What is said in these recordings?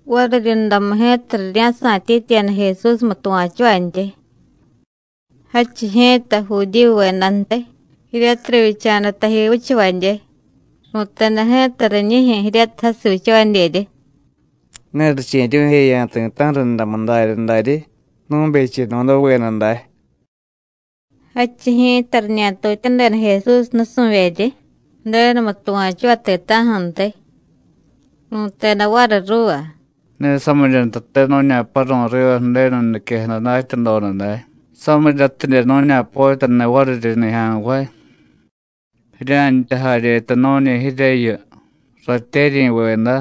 Variryundamu ji̱ta rirya̱sa̱tyityiyada Jesúsmu tuva̱chuvantyi. Jadchiy ji̱ta Judíyuvedantiy, jiryatiy rivyicha̱da taji vichavadye, ru̱teda ji̱ta riñijyu̱ jiryatiy jasiy vichavadyeryi: “Ne riche̱ryu̱jeya̱ ti̱ta̱ju̱ rundamu darya daryi nu̱becheno̱daveda day.” Jadchiy ji̱ta, riñatutyadeda Jesús nusu̱vyeryi Ju̱denumu tuva̱chuvay ti̱ta̱ju̱ntiy. Ru̱teda variy ruuva: “Ne samirya ntate nu̱ña̱paru̱y riva Ju̱denu niquejada datyadoda day, samiryatidye nu̱ña̱potyaniy variryi nijya̱nvay. Jirya̱ntya jaryeta nu̱ñi jiryeyu, ratyeryi̱veda,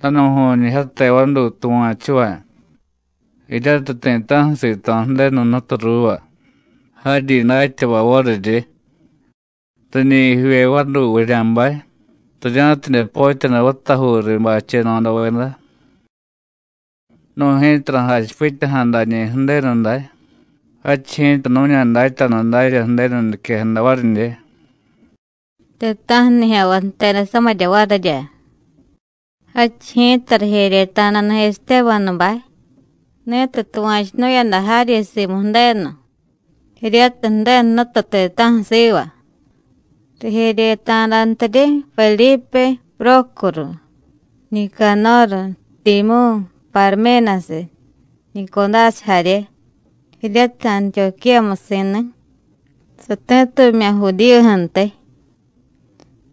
danu̱ju̱ñijyate vaduy tuva̱chuvay, jiryatiy ti̱ta̱ju̱ sito̱ Ju̱denu Jnutu ruuva, jaryi datyavay variryi. Riñi jivye vaduy vurya̱bay, rirya̱tidye potyaniy vatajuu riy bacheno̱daveda. Nu̱y ji̱ta ra̱jachipityaja̱ dañi̱ Ju̱denu day, jadchiy ji̱ta nu̱ña̱datyanu darya Ju̱denu niquejada varidye.” Ti̱ta̱ju̱ nijya̱nvay jteda samirya varirya. Jadchiy ji̱ta rijeryeta̱dani̱ Estébanubay, ni̱tiy tuva̱chunu̱yada jaryi simu Ju̱denu, jiryatiy Ju̱denu Jnutu ti̱ta̱ju̱ siva. Rijeryeta̱dantiryi Vedípe, Prócoru, Nicanóru, Timyú̱, Parménasiy, Nicudásiy jarye, jiryatiy Antiyuquíyamusi̱ni̱, sati̱tumya̱ Judíyuju̱ntiy.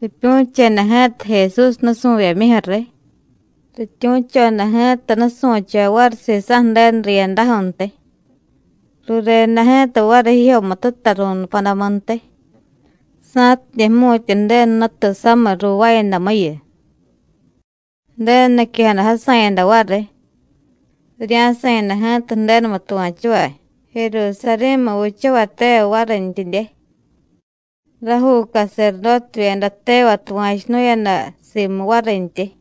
Ripyu̱cheda ji̱ta Jesús nusu̱vyemyuju̱ riy, rityu̱choda ji̱ta nusu̱chavay variy sisa̱ Ju̱denu riyadaju̱ntiy, rureda ji̱ta variy jijyomututa ru̱nupadamuntiy sa̱tidye jmu̱tya Ju̱denu Jnutu samiy ruuvaayadamuyu. Ju̱denu niquejada jasa̱yada variy, rirya̱sa̱yada ji̱ta Ju̱denumu tuva̱chuvay Jerusarí̱mu vichavay tevay varintyidye. Rajuu caserdótevyeda tevay tuva̱chunu̱yada simu varintyi.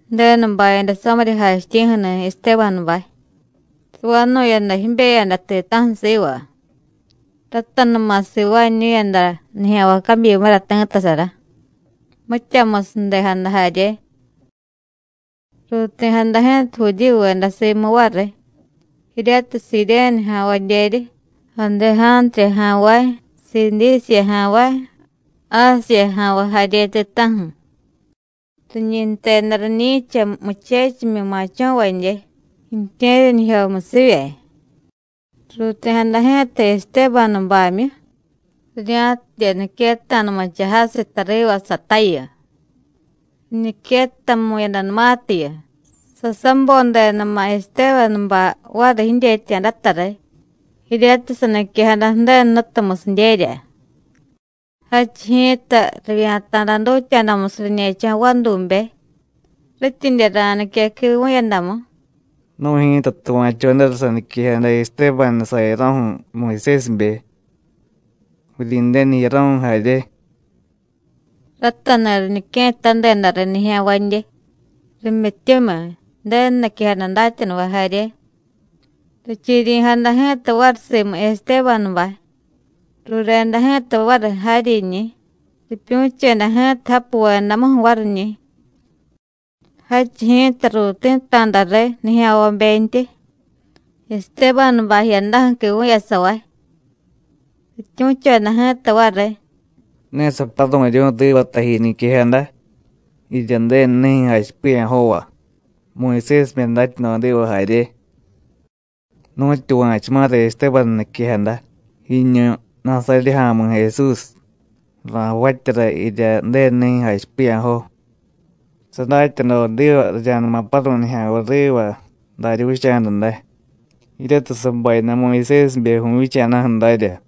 Ju̱denu bayada samirya jachityi̱ju̱ni̱ Estébanubay, savanu̱yada jibeyada ti̱ta̱ju̱ siva. Ratanuma sivaañu̱yada nijya̱nvay cabyimura ti̱ttasara, mityamusiy ju̱dejada jarye. Ruuti̱jada ji̱ta Judíyuveda simu variy, jiryatiy Siréne ja̱nvadyeryi, Adejántriya ja̱nvay, Sidísiya ja̱nvay, Ásiya ja̱nvay jarye ti̱ta̱ju̱. Riñi jteda riñi̱cha Muchechimyi Ma̱cho̱vadye ju̱tye̱ryanijyomusivye. Ruuti̱jada ji̱ta Estébanubamyu, rirya̱tidye niquetta̱numucha jasiy tariva satayu. Riñiquettamu̱yadanumatiyu, sasabodedama̱ Estébanubay variy jidyetya̱data riy, jiryatiy saniquejada Ju̱denu Jnutumusidyerya. Jadchiy ji̱ta rivya̱ta̱da dutya̱damusiy riñe̱cho̱ vadube, rityidye ra̱nique quivu̱yadamu: “Nu̱y ji̱ta tuva̱chodara saniquejada Estébanu sayaro̱ju̱ Muyusésibe, Vuryi̱ndenu jiyaro̱ju̱ jarye.” Ratani̱ riñique̱ttadeda riy nijya̱nvadye, rimyityumiy, Ju̱denu niquejada datyanuvay jarye. Richiryi̱jada ji̱ta variy simu Estébanubay, rureda ji̱ta variy jaryiñi̱, ripyu̱cheda ji̱ta japuvedamuju̱ variñi̱. Jadchiy ji̱ta ruuti̱ta̱da riy nijya̱nvabentyi, Estébanubay jiyadaju̱ quivu̱yasavay. Rityu̱choda ji̱ta variy: “Ne saparu̱ryu̱y riva taji niquejada, jirya Ju̱denu nijyu̱ jachipiya̱jova, Muyusésibe datyadodiva jarye. Nu̱tyuva̱chuma̱ra Estébanu niquejada: Jiñu Nasaryé Ja̱mi̱ Jesús, ra̱javatyara jirya Ju̱denu nijyu̱ jachipiya̱jo. Sadatyadodiva rirya̱numa paru̱y nijya̱nvay riva darya vicha̱da day, jiryatiy sabayada Muyusésibe vu̱vyicha̱daju̱ darya.”